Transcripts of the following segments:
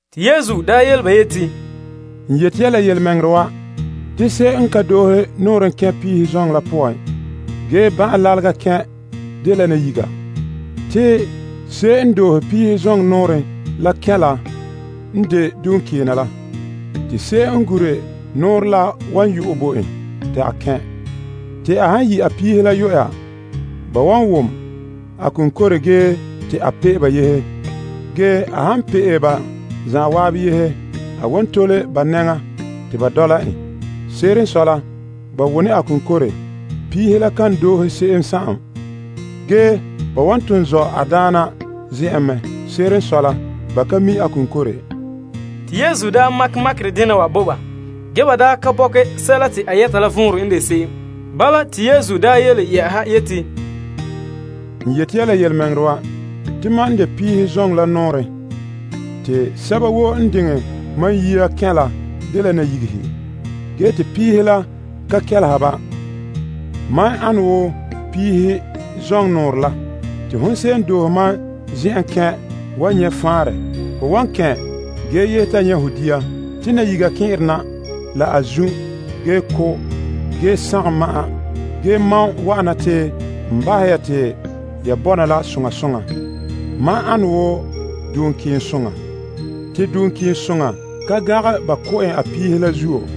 Te Yesu yele ba yeti, N yeti ya la yelemɛŋɛrɛ wa, te se'em n ka doohe nɔɔrɛn kɛn' piihe zoŋɔ la poan, ge ban'ɛn lalega kɛn', dela nayiga. Te se'em n doohe piihe zoŋɔ nɔɔrɛn la kɛn' la n de duŋkeena la. Te se'em n gure nɔɔrɛn la wan yu'ɛ bo en ta kɛn'. Ta a han yi' a piihe la yuya, ba wan wom a konkore ge te a pe'e ba yehe. Ge a han pe'e ba zan'an yehe, a wan tole ba nɛŋa te ba dɔla en. Se'ere n sɔe la, ba wone a konkore. Piihe la kan doohe se'em. Ge, ba wan ton zɔ' a daana zen'en mɛ. Se'ere n sɔe la, ba ka mi' a konkore. Te Yesu daa makɛ makerɛ dena wa bo ba. Ge, ba daa ka bɔkɛ sɛla te a yɛta la vɔnrɛ n de se'em. Te Yesu le yeti, N yeti ya la yelemɛŋɛrɛ wa, te mam n de piihe zoŋɔ la nɔɔrɛn. Te sɛba woo n diŋɛ mam yia kɛn' la dela nayigehe. Ge te piihe la ka kelehe ba. Mam ane wo piihe zoŋnɔren la. Te hon se'em n doohe mam zen'en kɛn' wan nyɛ' faanrɛ. Ho wan kɛn' ge yehe ta nyɛ' ho dia. Te nayiga kɛn'ɛre na la a zun', ge ko' ge sagom ma'an. Ge mam wa'ana te n bahɛ ya te ya bɔna la soŋa soŋa. Mam dela duŋkeensoŋa. Te duŋkeensoŋa ka gangɛ ba ko' en a piihe la zuo.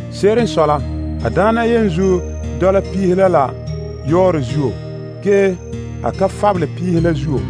Se'ere n sɔe la, a daana yenzuo dɔla piihe la la a yɔɔrɛ zuo. Ge, a ka fabele piihe la zuo.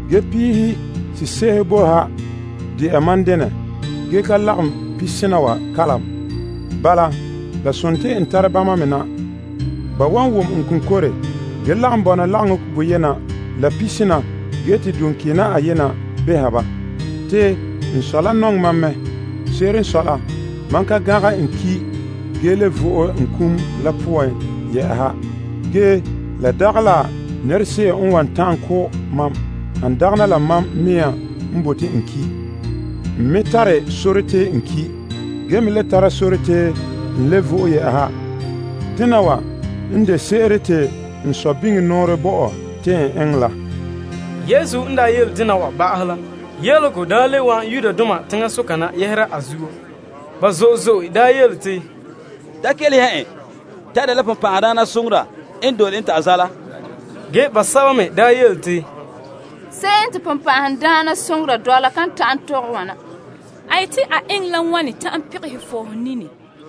Ge piihe sese'ehe boe ha de'a mam denɛ, ge ka lagom pesena wa kalam. Bala, la sontii n tare bama me na. Ba wan wom n konkore ge lagom bɔna lagaŋɔ boyena la pesena ge te duŋkeena ayena behɛ ba. Te n Sɔ la nɔŋɛ mam mɛ. Se'ere n sɔe la, mam ka gangɛ n ki', ge le vo'e n kum la poan. Ge la dagɛ la nɛrese'em n wan ta'an ko' mam, han dagana mam mea n bote te n ki'. N me tare sore te n ki'. Ge me le tare sore te n le vo'e. Dena wa n de se'ere te n Sɔ la bo mam nɔɔrɛ te n eŋɛ la. Yesu n daa yele dena wa ba'ahɛ la, yelehego le wa'an Yudoma teŋasoka na a yele zuo. Ba zo'e zo'e yele te, Da kelehe ya en, te bonbɛ'ɛhe n dole en ta zaala. Ge, basɛba me daa yele te, Se'em te bonbɛ'ɛhe dɔla kan ta'an tɔgɛ wana: a yeti a eŋɛ la wane ta'an pegɛha fɔɔhe nini?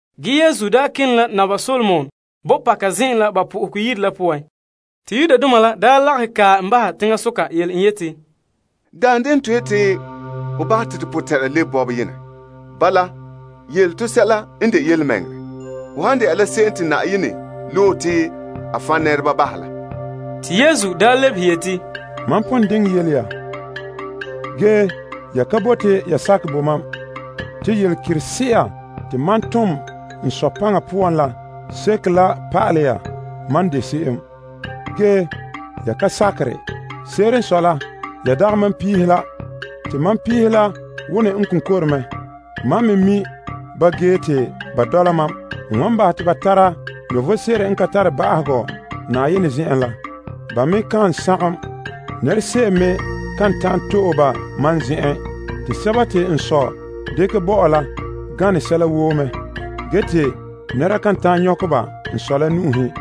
Ge Yesu daa kene la Naba Solomon bɔpaka zen'an la ba Yenɛ Yire la poan. Te Yudoma la lagahɛ kae en bahɛ teŋasoka yele en yeti, Daan denɛ te ho yeti ho bahɛ te to potɛn'ɛra lebe bɔberɛ yenɛ? Bala, yele to yelemɛŋɛrɛ hon de Se'em Te Yenɛ Loe La? Te Yesu lebehe yeti, Mam pon diŋɛ yele ya. Ge, ya ka bote ya sakɛ bo mam. Te yelekerese'a te mam tom n Sɔ paŋa poan la seke la pa'alɛ ya mam de se'em. Ge, ya ka sakere. Se'ere n sɔe la, ya dagɛ mam piihe la. Te mam piihe la wone n konkore mɛ. Mam me mi' ba ge te ba dɔla mam. N wan bahɛ te ba tara vom sebo n ka tare ba'ahegɔ Na'ayenɛ zen'en la. Ba me kan sagom. Nɛrese'em me kan ta'an to'e ba mam zen'en. Te sɛba te n Sɔ dekɛ bo mam la gane sɛla woo mɛ. Ge te nɛra kan ta'an nyɔkɛ ba n Sɔ la nu'uhen.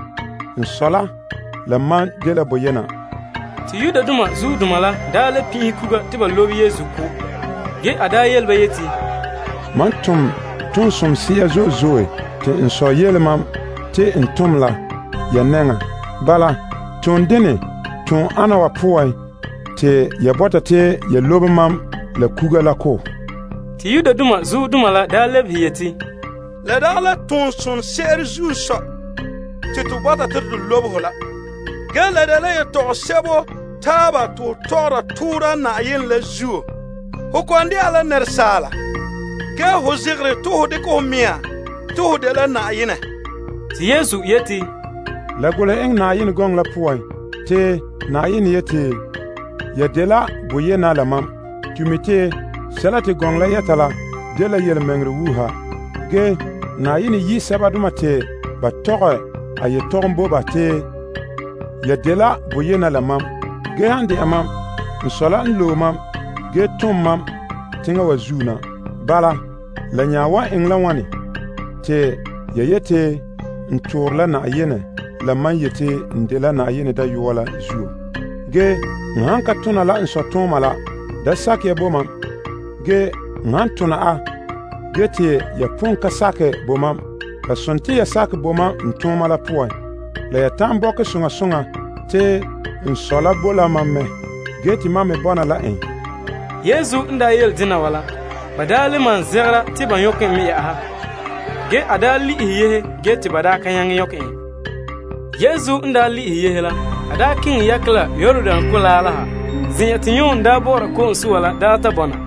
N Sɔ la, la mam dela boyena. Te Yudoma la nya le pin'ihe kuga te ba lobe Yesu ko'. Ge, a yele ba yeti, Mam tom toon somse'a zo'e zo'e te n Sɔ yele mam te n tom la ya nɛŋa. Bala, toon dene wa poan te ya bɔta te ya lobe mam la kuga la ko'. Te Yudoma la lebehe yeti, La dagɛ la tonsoŋse'ere zuo n sɔe te to bɔta te to lobe ho la. Ge, la dela yetɔgom sebo taaba te ho tɔgɔra toora Na'ayenɛ la zuo. Ho kɔ'ɔn de'a la asaala. Ge, ho zegɛre te ho dekɛ ho mea te ho dela Na'ayenɛ. Te Yesu yeti, La golehɛ ya Pa'alegɔ la poan yeti, Mam yeti, ya dela yena. To mi' te sɛla te gɔŋɔ la yɛta la dela yelemɛŋɛrɛ wuuha. Na'ayenɛ yi' sɛbadoma te ba tɔgɛ a yetɔgɔm bo ba dela yena. Ge han de'a mam, n Sɔ la n loe mam ge tom mam teŋa wa zuo na. Bala, la nya wan eŋɛ la wane te ya yeti n toore la Na'ayenɛ la mam yeti n dela Na'ayenɛ Dayɔa la zuo? Ge n han ka tona la n Sɔ tooma la, da sakɛ ya bo mam. Ge, n han tona a, ge te ya pon ka sakɛ bo mam, la sontii ya yi sakɛ bo n tooma la poan. La ya ta'an bɔkɛ soŋa soŋa te n Sɔ la boe la mam mɛ ge te mam me bɔna la en. Yesu n yele dena wa la, ba daa le malom zegɛra te ba nyɔkɛ en. Ge, a daa le'ehɛ yehe ge te ba ka nyaŋɛ nyɔkɛ en. Yesu n daa le'ehɛ yehe la, a keŋɛ yakɛ la Yordan Kolaa la ha, zen'an te Yon daa bɔ'ɔra ko'om soa la daa ta bɔna.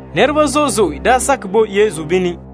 Nɛreba zo'e zo'e daa sakɛ bo Yesu bini.